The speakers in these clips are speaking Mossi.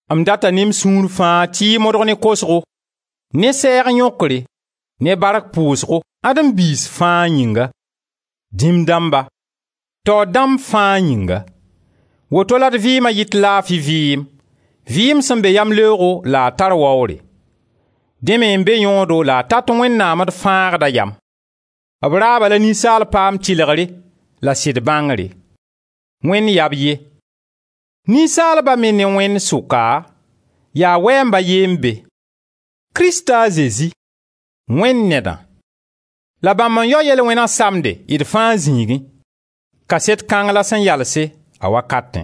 M data ne m sũur fãa tɩ y modg ne kosgo, ne sɛɛg yõkre, ne bark pʋʋsgo Adem biis fãa yĩnga, dĩm dãmba, taoor dãmb fãa yĩnga; woto la d vɩɩma yɩt laafi vɩɩm, vɩɩm sẽn be yamleoogo la a tar waoore. Dẽ me n be yõodo la a tat Wẽnnaam, d Fãagda, yam. B raaba la ninsaal paam tɩlgre la sɩd bãngre. Wẽnd yaa b ye. Ninsaalba me ne Wẽnd sʋka, yaa Wɛɛmb a ye n be: Krista a Zezi, Wẽnd Nedã. La bãmb n yao yel-wẽna samde d fãa zĩigẽ. Kaset kãng la sẽn yalse, a wakatẽ,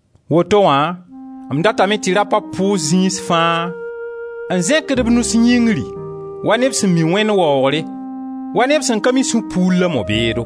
Woto wã m datame tɩ rapa pʋʋs zĩis fãa, n zẽkd b nus yĩngri, wa neb sẽn mi Wẽnd waoogre, wa neb sẽn ka mi sũ-puur la mo-beedo.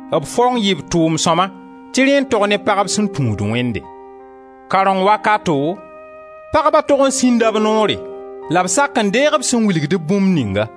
B faong yɩɩ b tʋʋm sõma tɩ rẽ n tog ne pagb sẽn tũud Wẽnde. Karẽng wakato, pagba tog n sĩnda b noore la b sak n deeg b sẽn wilgd-b bũmb ninga.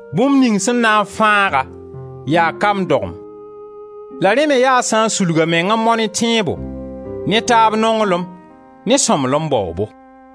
Bũmb ning sẽn na n fãag-a yaa kamb dogem la rẽ me yaa a sã n sulg a meng n mao ne tẽebo, ne taab nonglem, ne sõmblem baoobo.